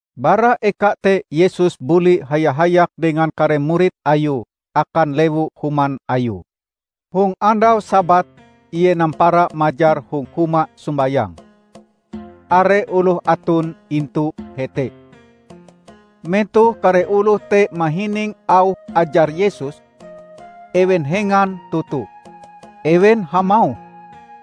Bara eka te Yesus buli haya-hayak dengan kare murid Ayue akan lewu-human Ayue. Hong andau Sabat Ie nampara majar hong huma sombayang. Are oloh aton intu hete. Metoh kare oloh te mahining auh ajar Yesus, ewen hengan toto. Ewen hamauh,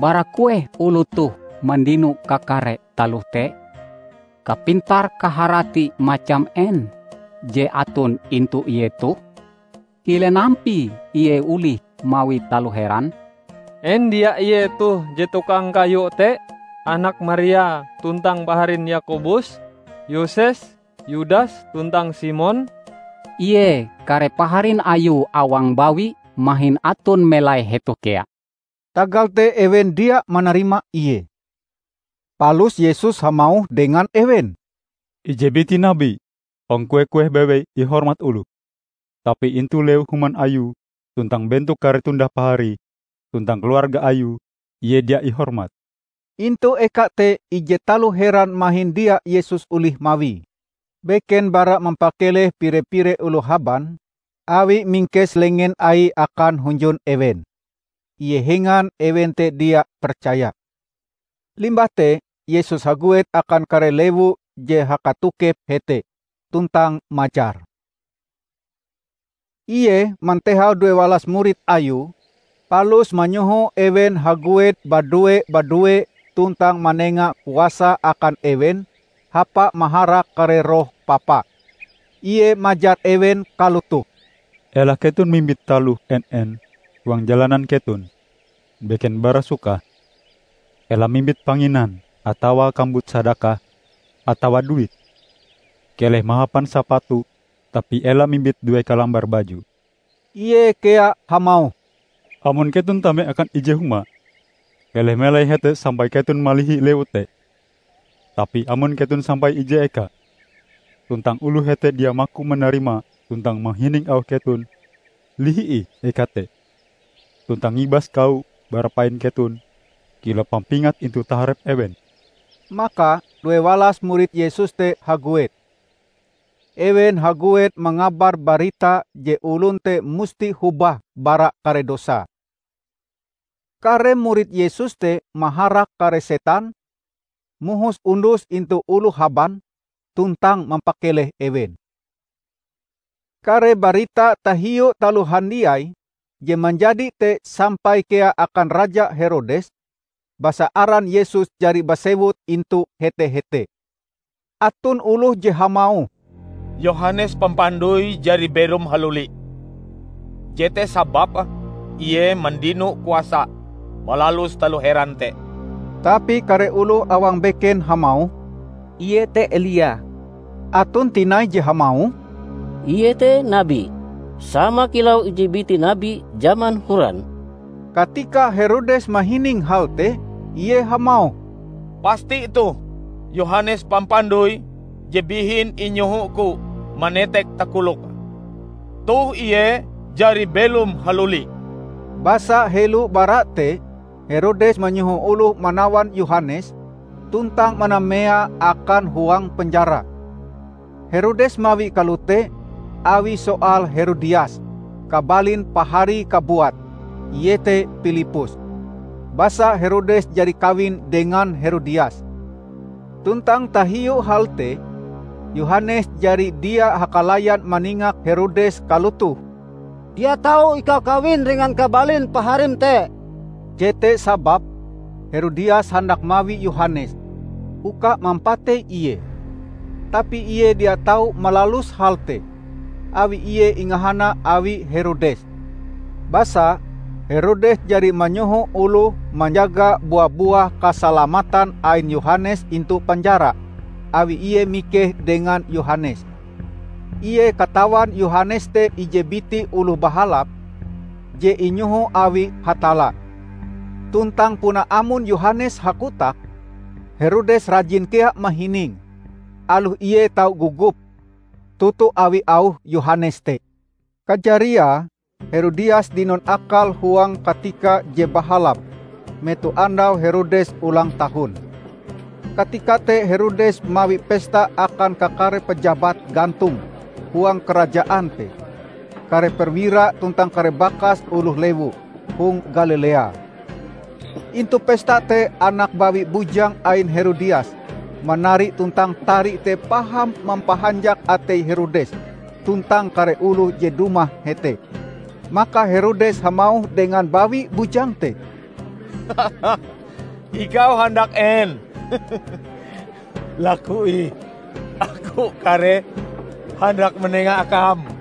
"Bara kueh oloh toh mandino kakare taloh te? Kapintar-kaharati macam en je aton intu Ie toh? Kilen ampie Ie olih mawi taloh heran? En dia Ie toh je tukang kayu te, anak Maria, tuntang paharin Yakobus, Yoses, Yudas tuntang Simon? Ie, kare paharin Ayue awang bawi mahin aton melai hetoh kea." Tagal te ewen dia manarima Ie. Palus Yesus hamauh dengan ewen, "Ije biti nabi, hong kueh-kueh bewei ihormat oloh, tapi intu lewu-human ayue, tuntang bentok kare tundah-paharie tuntang keluarga Ayue, ie dia ihormat." Intu eka te, ije taloh heran mahin dia Yesus olih mawie, beken bara mampakeleh pire-pire oloh haban awie mingkes lengen Aie akan hunjun ewen. Ie hengan ewen te dia percaya. Limbah te Yesus haguet akan kare lewu je hakatokep hete, tuntang majar. Ie mantehau duewalas murid Ayue palus manyoho ewen haguet badue-badue tuntang manenga kuasa akan ewen hapae maharak kare roh papa. Ie majar ewen kalotoh: "Ela keton mimbit taloh en-en huang jalanan keton, beken bara sukah. Ela mimbit panginan atawa kambut sadakah, atawa duit. Keleh mahapan sapatu tapi ela mimbit due kalambar baju." Ie kea hamauh, "Amon keton tame akan ije huma, keleh melai hete sampai keton malihi lewu te. Tapi amon keton sampai ije eka, tuntang oloh hete dia maku manarima tuntang mahining auh keton, lihi ih eka te. Tuntang ngibas kawo bara pain keton kilau pampingat intu taharep ewen!" Maka duewalas murid Yesus te haguet. Ewen haguet mangabar barita je olon te musti hobah bara kare dosae. Kare murid Yesus te maharak kare setan, mohos undus intu oloh haban tuntang mampakeleh ewen. Kare barita tahiu taloh handiai je manjadi te sampai kea akan Raja Herodes, basa aran Yesus jari basewut intu hete-hete. Aton oloh je hamauh, "Yohanes Pampandoi jari belom haluli! Jete sababe Ie mandino kuasa malalus taloh heran te." Tapi kare oloh awang beken hamauh, "Ie te Elia." Aton tinai je hamauh, "Ie te nabi, sama kilau ije biti nabi jaman horan." Katika Herodes mahining hal te, ie hamauh, "Pasti toh, Yohanes Pampandoi je bihin inyohoku manetek takoloke. Toh ie jari belom haluli!" Basa helo bara te Herodes manyoho oloh manawan Yohanes, tuntang manameae akan huang penjara. Herodes mawie kalote awi soal Herodias, kabalin paharie kabuat, iete Pilippus. Basa Herodes jari kawin dengan Herodias, tuntang tahiu hal te Yohanes jari dia hakalayan maningak Herodes kalotoh, "Dia tau ikau kawin dengan kabalin paharim te!" Jete sababe Herodias handak mawi Yohanes, uka mampatei ie, tapi ie dia tau malalus hal te, awi ie ingahana awi Herodes. Basa Herodes jari manyoho oloh manjaga bua-buah kasalamatan ain Yohanes intu penjara, awi ie mikeh dengan Yohanes. Ie katawan Yohanes te ije biti oloh bahalap je inyoho awi Hatalla. Tuntang puna amon Yohanes hakotak, Herodes rajin kea mahininge, aloh ie tau gogop toto awi auh Yohanes te. Kajariae Herodias dinon akal huang katika je bahalap metoh andau Herodes ulang tahun. Katika te Herodes mawi pesta akan kakare pajabat gantong huang karajaan te, kare perwira tuntang kare bakas oloh lewu hong Galilea. Intu pesta te anak bawi bujang ain Herodias manari tuntang tari te paham mampahanjak atei Herodes tuntang kare oloh je dumah hete. Maka Herodes hamauh dengan bawi bujang te, "Ikau handak en, laku ih. Aku kareh handak manenga akam!"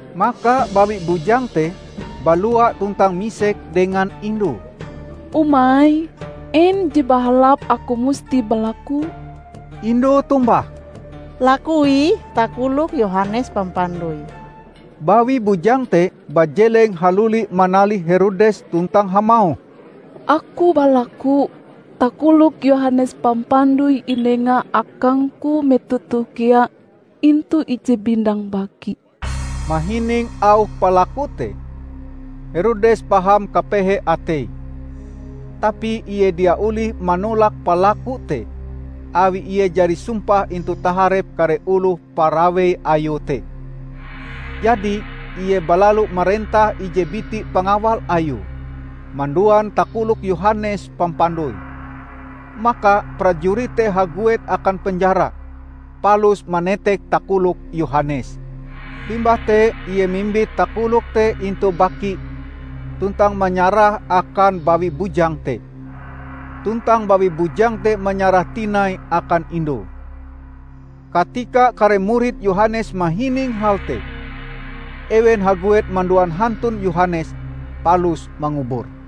Maka bawi bujang te balua tuntang misek dengan indue, "Umai, en je bahalap aku musti balakue?" Indue tombah, "Laku ih takolok Yohanes Pampandoi." Bawi bujang te bajeleng haluli manalih Herodes tuntang hamauh, "Aku balaku takolok Yohanes Pampandoi inenga akangku metoh toh kea intu ije bindang baki!" Mahining auh palakue te Herodes paham kapehe ateie. Tapi ie dia olih manolak palakue te awi ie jari sumpah intu taharep kare oloh parawei ayue te. Jadi ie balalu marentah ije biti pangawal ayue manduan takolok Yohanes Pampandoi. Maka prajurit te haguet akan penjara, palus manetek takolok Yohanes. Limbah te ie mimbit takolok te intu baki tuntang manyarahe akan bawi bujang te. Tuntang bawi bujang te manyarahe tinai akan indue. Katika kare murid Yohanes mahining hal te, ewen haguet manduan hantun Yohanes palus mangubure.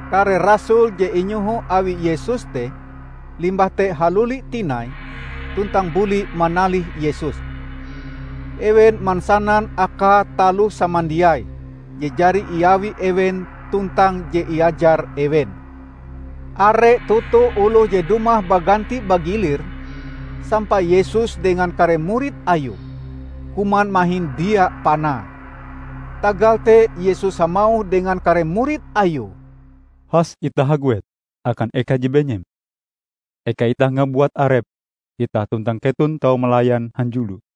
Kare rasul je inyoho awi Yesus te limbah te haluli tinai, tuntang buli manalih Yesus. Ewen mansanan akae taloh samandiai je jari iawi ewen tuntang je iajar ewen. Are toto oloh je dumah baganti-bagilir, sampai Yesus dengan kare murid Ayue, kuman mahin dia panae. Tagal te Yesus hamauh dengan kare murid Ayue, "Has itah haguet akan eka je benyem, eka itah ngabuat arep itah tuntang keton tau malayan hanjulo."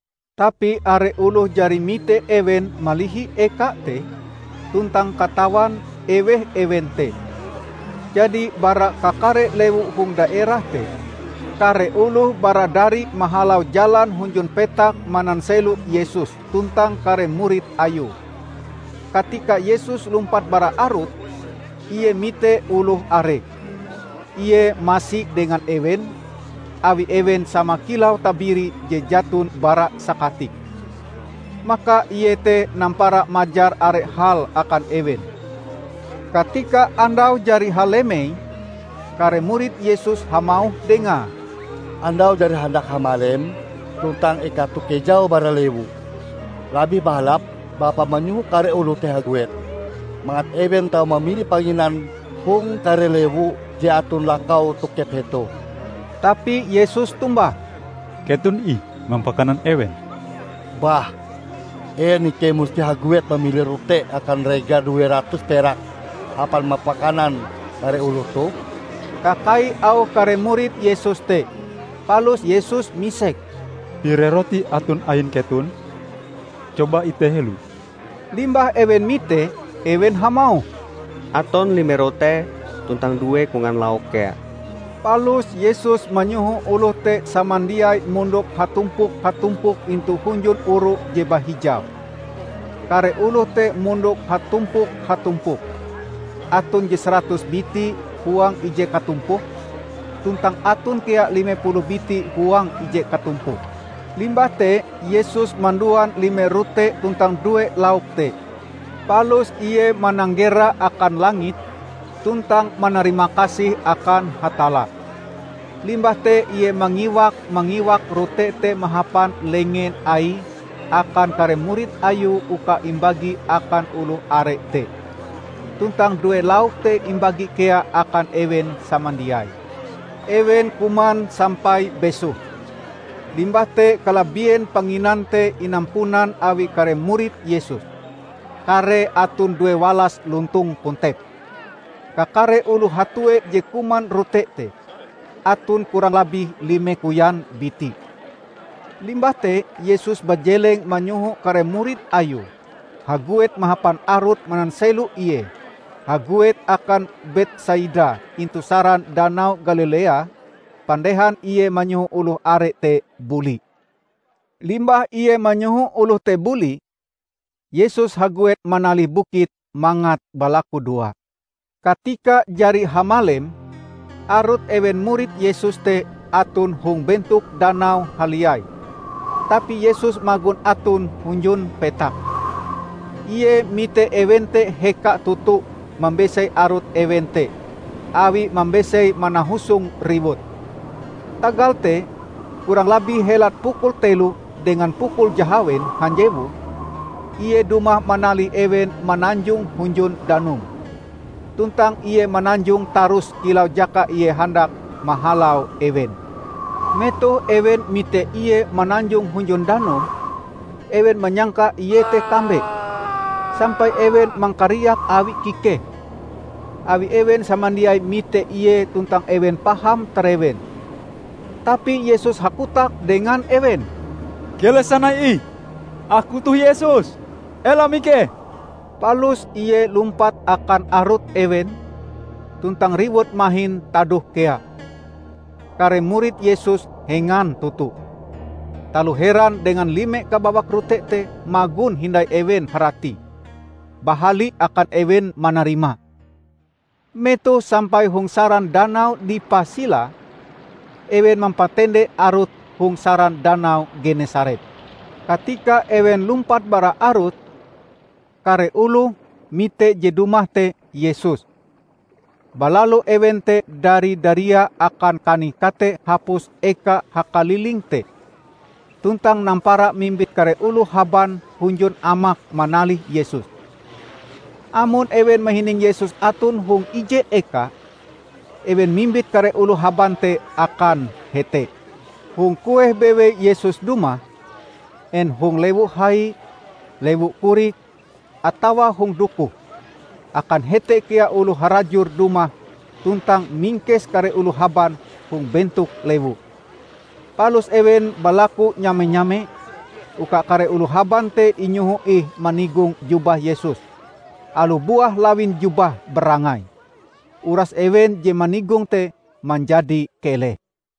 Tapi are oloh jari mite ewen malihi eka te, tuntang katawan, eweh ewen te. Jadi bara kakare lewu hong daerah te, kare oloh baradari mahalau jalan hunjun petak mananselo Yesus tuntang kare murid Ayue. Katika Yesus lumpat bara arut, Ie mite oloh are. Ie masi dengan ewen, awi ewen sama kilau tabiri je jaton bara sakatik. Maka Ie te nampara majar are hal akan ewen. Katika andau jari halemei, kare murid Yesus hamauh Dengae, "Andau jari handak hamalem tuntang eka toh kejau bara lewu. Labih bahalap Bapa manyoho kare oloh te haguet, mangat ewen tau mamili panginan hong kare lewu je aton lakau tokep hetoh." Tapi Yesus tombah, "Keton ih mampakanan ewen." "Bah, en ikei musti haguet mamili rote akan rega due ratus perak hapan mampakanan kare oloh toh?" kakai auh kare murid Yesus te. Palus Yesus misek, "Pire rote aton ain keton? Coba ite helo." Limbah ewen mitee, ewen hamauh, "Aton lime rote tuntang due kongan lauk kea." Palus Yesus manyoho oloh te samandiai mondok hatumpok-hatumpok intu hunjun oru je bahijau. Kare oloh te mondok hatumpok-hatumpok. Aton je saratus biti huang ije katumpok, tuntang aton kea lime puluh biti huang ije katumpok. Limbah te Yesus manduan lime rote tuntang due lauk te, palus Ie mananggera akan langit tuntang manarimakasih akan Hatalla. Limbah te Ie mangiwak-mangiwak rote te mahapan lengen Aie akan kare murid Ayue uka imbagi akan oloh are te. Tuntang due lauk te imbagi kea akan ewen samandiai. Ewen kuman sampai besoh. Limbah te kalabien panginan te inampunan awi kare murid Yesus -- karee aton due walas lontong kontep. Kakare oloh hatue je kuman rote te aton kurang labih lime koyan biti. Limbah te Yesus bajeleng manyoho kare murid Ayue haguet mahapan arut mananselo Ie haguet akan Betsaida intu saran danau Galilea, pandehan Ie manyoho oloh are te buli. Limbah Ie manyoho oloh te buli, Yesus haguet manalih bukit mangat balakudoa. Katika jari hamalem arut ewen murid Yesus te aton hong bentok danau haliai, tapi Yesus magon aton hunjun petak. Ie mite ewen te heka toto mambesei arut ewen te awi mambesei manahusong riwut. Tagal te, kurang labih helat pukul telo dengan pukul jahawen hanjewu, Ie dumah manalih ewen mananjong hunjun danum. Tuntang Ie mananjong tarus kilau jaka Ie handak mahalau ewen. Metoh ewen mite Ie mananjong hunjun danum, ewen manyangka Ie te kambe, sampai ewen mangkariak awi kikehe. Awi ewen samandiai mite Ie tuntang ewen paham tarewen. Tapi Yesus hakotak dengan ewen, "Keleh sanai ih! Aku toh Yesus. Ela mikeh!" Palus ie lumpat akan arut ewen, tuntang riwut mahin tadoh kea. Kare murid Yesus hengan toto. Taloh heran dengan lime kabawak rote te magon hindai ewen haratie. Bahali akan ewen manarimae. Metoh sampai hong saran danau dipah silae, ewen mampatende arute hong saran danau Genesaret. Katika ewen lumpat bara arut, kare oloh mite je dumah te Yesus. Balalu ewen te dari-daria akan kanih-kate hapus eka hakaliling te, tuntang nampara mimbit kare oloh haban hunjun amak manalih Yesus. Amon ewen mahining Yesus aton hong ije eka, ewen mimbit kare oloh haban te akan hete. Hong kueh bewei Yesus dumah, en hong lewu hai, lewu korik, atawa hong dukoh, akan hete kea oloh harajur dumah tuntang mingkes kare oloh haban hong bentok lewu. Palus ewen balaku nyame-nyame uka kare oloh haban te inyoho ih manigong jubah Yesus, aloh buah lawin jubahe barangai. Uras ewen je manigonge te manjadi keleh.